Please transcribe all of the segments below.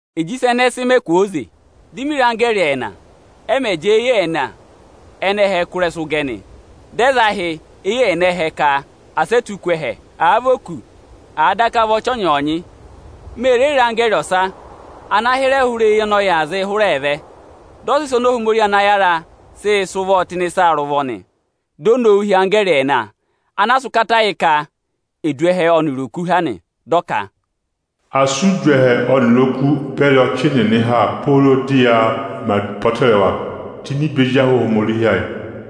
Ịjị ịsa ẹnẹẹ sị mẹ kwooze, di mi re anggẹẹrị ẹẹna, ẹ mẹ̀ jẹẹ eyi ẹẹna ẹnẹ ẹhẹ kụ́ ịrẹsụ gẹ nị. Dị ẹ za ahị eyi ẹẹna ẹhẹ ka asị ẹ tụ́ ku ẹhẹ, àa vị oku, àa daka vị ọchị ọnyọọnyị. Me re re anggẹẹrị ọsa ana hịrẹ hụrị eyi ọnị ọyịị̄ zịị hụrẹ vẹ. Dị ọ sị ịsa oni Ohomorihi ana yára sịị̄ sị ụvọọ tụ́ ịnị ịsa rị ụvọ nị. Dị ọ nowu hị́ anggẹẹrị ẹẹna ana a sị ụkata yị ka è du ẹhẹ ọnịrị eku ha nị. Dị ọ ka: Asị e du ẹhẹ ọnịrị oku beri ọchị nịnị ha pooro dị ẹnị ẹ̀ mẹ apọtẹrẹwa tụ́ ini ibe ezi ahụ Ohomorihi ẹnịnị.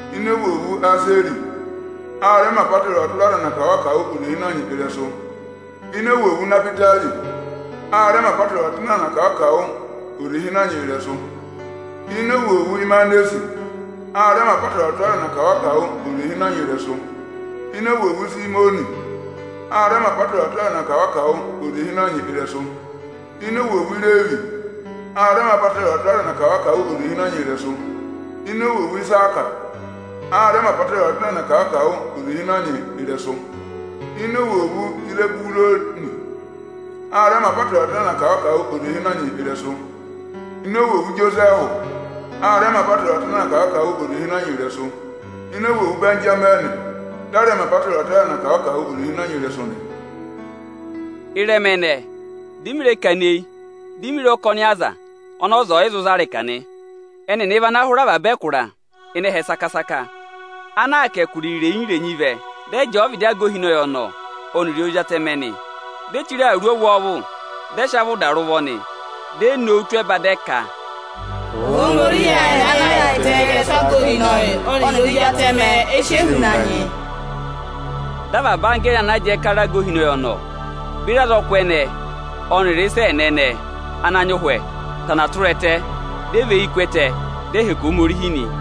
Ini ovwoovu Aseri, a rẹ mẹ̀ apọtẹrẹwa tụra aza ẹnị akawụ-akawụ oze ịhịnọnyị ịrẹsụ. Ini ovwoovu Inahwitari, â mẹ apọtẹrẹwa tụra aza ẹnị akawụ-akawụ oze ịhịnọnyị ịrẹsụ. Ini ovwoovu Ịmanasẹ, a rẹ mẹ apọtẹrẹwa tụra aza ẹnị akawụ-akawụ oze ịhịnọnyị ịrẹsụ. Ini ovwoovu Isimiyọnị, â mẹ apọtẹrẹwa tụra aza ẹnị akawụ-akawụ oze ịhịnọnyị ịrẹsụ. Ini ovwoovu Ireevi, a rẹ mẹ apọtẹrẹwa tụra aza ẹnị akawụ-akawụ oze ịhịnọnyị ịrẹsụ. Ini ovwoovu Iisaka, a rẹ mẹ apọtẹrẹwa tụra aza ẹnị akawụ-akawụ oze ịhịnọnyị ịrẹsụ. Ini ovwoovu Izeburuni, â mẹ apọtẹrẹwa tụra aza ẹnị akawụ-akawụ oze ịhịnọnyị ịrẹsụ. Ini ovwoovu Ijosẹẹhụ, a rẹ mẹ apọtẹrẹwa tụra aza ẹnị akawụ-akawụ oze ịhịnọnyị ịrẹsụ. Ini ovwoovu Ịbẹnjamịnị, dị a rẹ mẹ apọtẹrẹwa tụra aza ẹnị akawụ-akawụ oze ịhịnọnyị ịrẹsụ nị. Ị́rẹma ẹnẹẹ, dị mị rẹ kana eyi, di mi re ọkọnị aza ọnị ọza ọ̀ yị zụ za ịrịka nị. Ẹnịnị vị ana hụrẹ avaba ẹkụra ịnị ẹhẹ saka-saka ana aa kà ẹkụra irenyi-irenyi vẹ, dị ẹ jẹẹ ọvịdị aga ohinọyị ọnọọ, ọnịrị ọvịdị Ozi Atẹmẹ nị. Ẹnịnị vi ene chire awuru ọvwọọvụ, dị ẹ sị avị ụda rị ụvọ nị. Di e nowu tụ́ ẹba, dị ẹ ka: Ohomorihi ayị ana yaayịtẹ ịrẹsụ aga ohinọyị ọnịrị Ozi atẹmẹ ọọ̄ dọ ọza ha nị. Dị avaba anggẹẹrị ana jẹẹ kara aga ohinọyị ọnọọ, beri azọkụ ẹnẹẹ ọnịrị ịsa ẹẹna ẹnẹẹ ana nyị ụhwẹ aanị, tana tụra ẹtẹ, dị ẹ và eyi ku ẹtẹ, dị ẹ hẹkẹ Ohomorihi nị.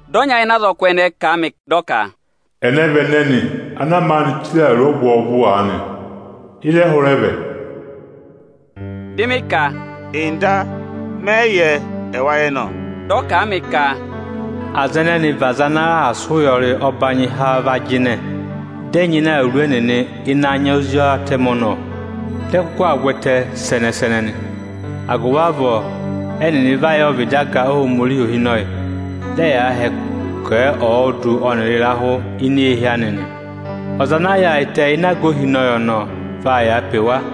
Dị ọnya ịnị azọkụ ẹnẹẹ họ̀ mị, dị ọ ka: Ẹnẹ vị ẹnẹnị ana maanị chire awuru ọvwọọvụ aanị? Ịzị ẹ hụrẹ vẹ? Dị mị ka: Nda, mẹ yị yẹ, ẹwa yẹ nọ. Dị ọ kà a mị ka: Aza ẹnẹnị ẹ vị aza ana sị ụya ọbanyị há va jịnẹ, dị ẹ nyịna awuru ẹnịnị ịnị anya Ozi Atẹmẹ ọnọọ, dị ẹ kụkụ aa vwẹtẹ sẹnẹ-sẹnẹ nị. Agụvị avọọ, ẹ́nịnị va yà ọvịdị aga Ohomorihi ohinọyị, dị ẹyaa hẹkẹ ẹ ọọdụ ọnịrị ịrahụ ini eehi anị nị. Ọza ana yaayịtẹ ịnị aga ohinọyị ọnọọ vaa yàa pe wa.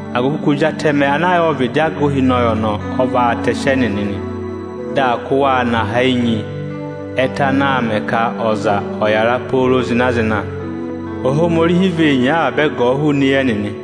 Agụvị ka Ozi Atẹmẹ ana yà ọvịdị aga ohinọyị vaa tẹsị ẹnịnị anka oseratẹmẹ. Dị aa kụ́ waa nọ aha ene enyi ẹtẹ anaā mẹ ka ọza ọ̀ yàra pooro zịna-zịna yà. Ohomorihi vee nyee avaba ẹgọọ hụụnị eyi ẹnịnị.